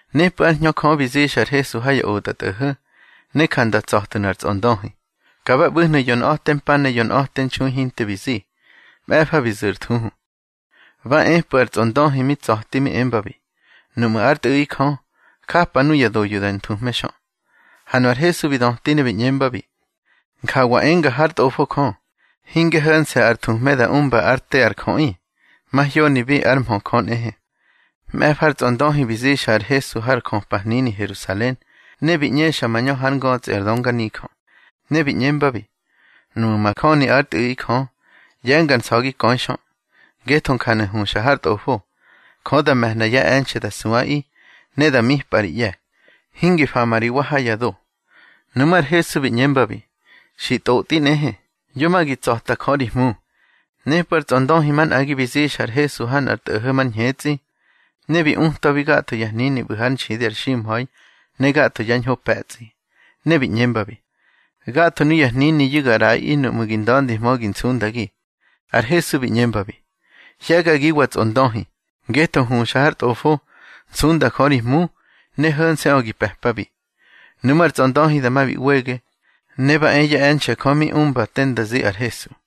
Nepꞌu̱ ár Hñö Jö bi zixa ar Hesu ha ya otꞌatꞌo̱ho̱, ne ja nda tsa̱tnu̱ ar tsꞌondöhi. Ka ba ꞌbu̱hnu̱ yonꞌa̱te mpa ne yonꞌa̱te nxui hinte bi zi. Mꞌe̱fa bi zu̱ ar thuhu. Ba epꞌu̱ ar tsꞌondöhi mi tsa̱ti mi embabi: —Nuꞌmu̱ ár Tꞌu̱ꞌi Jö, japa nuya doyu̱ da nthuhme xö. Ha nu ar Hesu bi döti ne bi ꞌñembabi: —Njawa enga hár Tꞌofo Jö: Hinge ho̱nse̱ ar thuhme da umba ár te ar jöꞌi, mahyonibi ár mhö Jö nꞌehe. Mꞌe̱fa ar tsꞌondöhi bi zixa ar Hesu har jöpahnini Herusalen, ne bi ꞌñexa mañö hár ngötsꞌi ar dönganijö. Ne bi ꞌñembabi: —Nuꞌmu̱ majöni ár Tꞌu̱ꞌi Jö, ꞌye̱nga ar nsa̱gi köi xö, ngetho njanu̱ huxa har Tꞌofo: Jö da me̱hna yá e̱nxe̱ da suꞌaꞌi, ne da mipꞌa ri ꞌye̱, hingi fama ri wa ha ya do. Nuꞌmú̱ ar Hesu bi ꞌñembabi: —Xi tꞌotꞌi nꞌehe: Yo ma gi tsa̱ta Jö ri Hmu. Nepꞌu̱ ar tsꞌondöhi manꞌagi bi zixa ar Hesu ha nꞌar tꞌo̱ho̱ mar ñhetsꞌi, ne bi utwabi gatho ya hnini ꞌbu̱ hár nxidi ar ximha̱i ne gatho yá ñho pe̱tsꞌi. Ne bi ꞌñembabi: —Gatho nuya hniniyu̱ ga ꞌraꞌi nuꞌmu̱ gi nda̱ndihmö gi nsundagi. Ar Hesu bi ꞌñembabi: —Hye̱gagiwa tsꞌondöhi, ngetho huxa har Tꞌofo: Nsunda Jö ri Hmu, ne ho̱nse̱ꞌö gi pe̱pabi. Nuꞌmú̱ ar tsꞌondöhi dama bi ꞌwege, ne ba e yá e̱nxe̱ Jö mi umba te nda zi ar Hesu.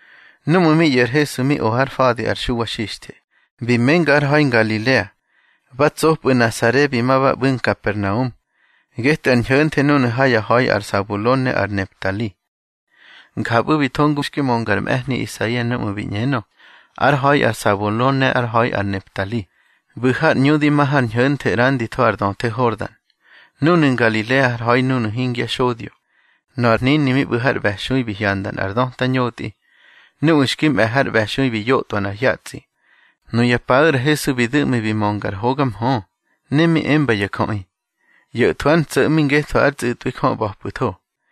Núꞌmu̱ mi ꞌyo̱ ar Hesu mi o har fa̱di ar Xuwa Xixthe, bi menga har ha̱i Ngalilea. Ba tsopꞌu̱ Nasare bi ma ba ꞌbu̱ Nkapernaum, getꞌu̱ ar ñho̱nthe núnu̱ ha yá ha̱i ar Sabulon ne ar Neftali. Njapꞌu̱ bi tho ngu xki mönga ar mꞌe̱hni Isaia núꞌmu̱ bi ꞌñenö: Ár ha̱i ar Sabulon ne ár ha̱i ar Neftali, ꞌbu̱ har ꞌñu di ma har ñho̱nthe ꞌranditho ar döthe Hordan, núnu̱ Ngalilea ár ha̱i nuꞌu̱ hingya xodyo. Nöꞌö ar hnini mi ꞌbu̱ har ꞌbe̱xui bi hyanda nꞌar döta ñotꞌi. Nuꞌu̱ xki mꞌe̱ har ꞌbe̱xui bi yotꞌwa nꞌar hyatsꞌi. Nuya paꞌu̱ ar Hesu bi du̱ꞌmi bi mönga ar hoga mhö, ne mi emba ya jöꞌi: —ꞌYo̱thwu̱ ár ntso̱ꞌmi ngetho ár tsꞌu̱tꞌwi Jö ꞌba̱pꞌu̱tho.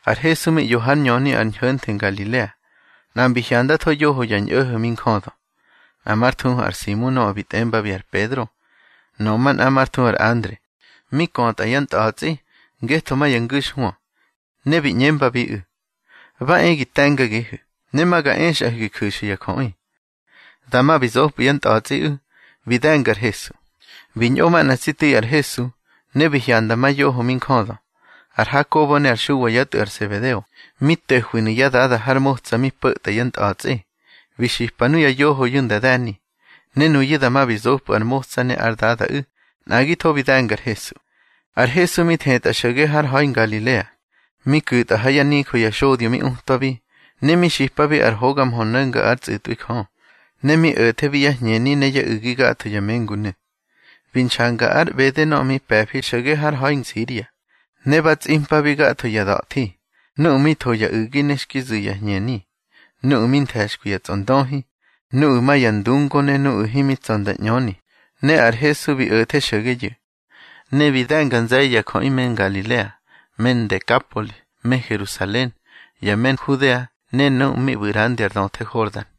Ar Hesu mi ꞌyo hár ñöni ar ñho̱nthe Ngalilea. Nꞌa mbi hyandatho yoho ya ñꞌo̱ho̱ mi njödö, nꞌa már thuhu ar Simu nöꞌö bi tꞌembabi ar Pedro, nöꞌö manꞌa már thuhu ar Andre, mi kötꞌa yá ntꞌa̱tsꞌi, ngetho ma ya ngu̱xhwö. Ne bi ꞌñembabiꞌu̱: —Ba e gi te̱ngagihu̱, ne ma ga exꞌahu̱ gi ju̱xu̱ ya jöꞌi. Dama bi zopꞌu̱ yá ntꞌa̱tsꞌiꞌu̱, bi de̱nga ar Hesu. Bi ñꞌo manꞌa tsi tu̱i ar Hesu, ne bi hyanda ma yoho mi njödö, ar Hakobo ne ar Xuwa yá tꞌu̱ ar Sebedeo, mi to̱hwinu̱ yá dada har motsa mi po̱tꞌa yá ntꞌa̱tsꞌi. Bi xipa nuya yohoyu̱ nda de̱ni. Ne nuyu̱ dama bi zopꞌu̱ ar motsa ne ár dadaꞌu̱, nꞌagitho bi de̱nga ar Hesu. Ar Hesu mi thetꞌa xo̱ge har ha̱i Ngalilea, mi ku̱tꞌa ha yá nijö ya xodyo mi utwabi, ne mi xipabi ar hoga mhö no̱nga ár tsꞌu̱twi Jö. Ne mi o̱thebi yá hñeni ne yá u̱gi gatho ya mengunu̱. Bi nxanga ar ꞌbede nöꞌö mi pe̱fi xo̱ge har ha̱i Nsiria. Ne ba tsꞌimpabi gatho ya da̱thi, nuꞌu̱ mi tho ya u̱gi ne xki zu̱ ya hñeni, nuꞌu̱ mi nthe̱xkwi ya tsꞌondöhi, nuꞌu̱ ma ya ndungo ne nuꞌu̱ himi tsa̱ nda ꞌñöni. Ne ar Hesu bi o̱the xo̱geyu̱. Ne bi de̱nga nze̱ye̱ ya jöꞌi me Ngalilea, me Ndekapoli, me Herusalen, ya me Nhudea ne nuꞌu̱ mi ꞌbu̱ ꞌrandi ar döthe Hordan.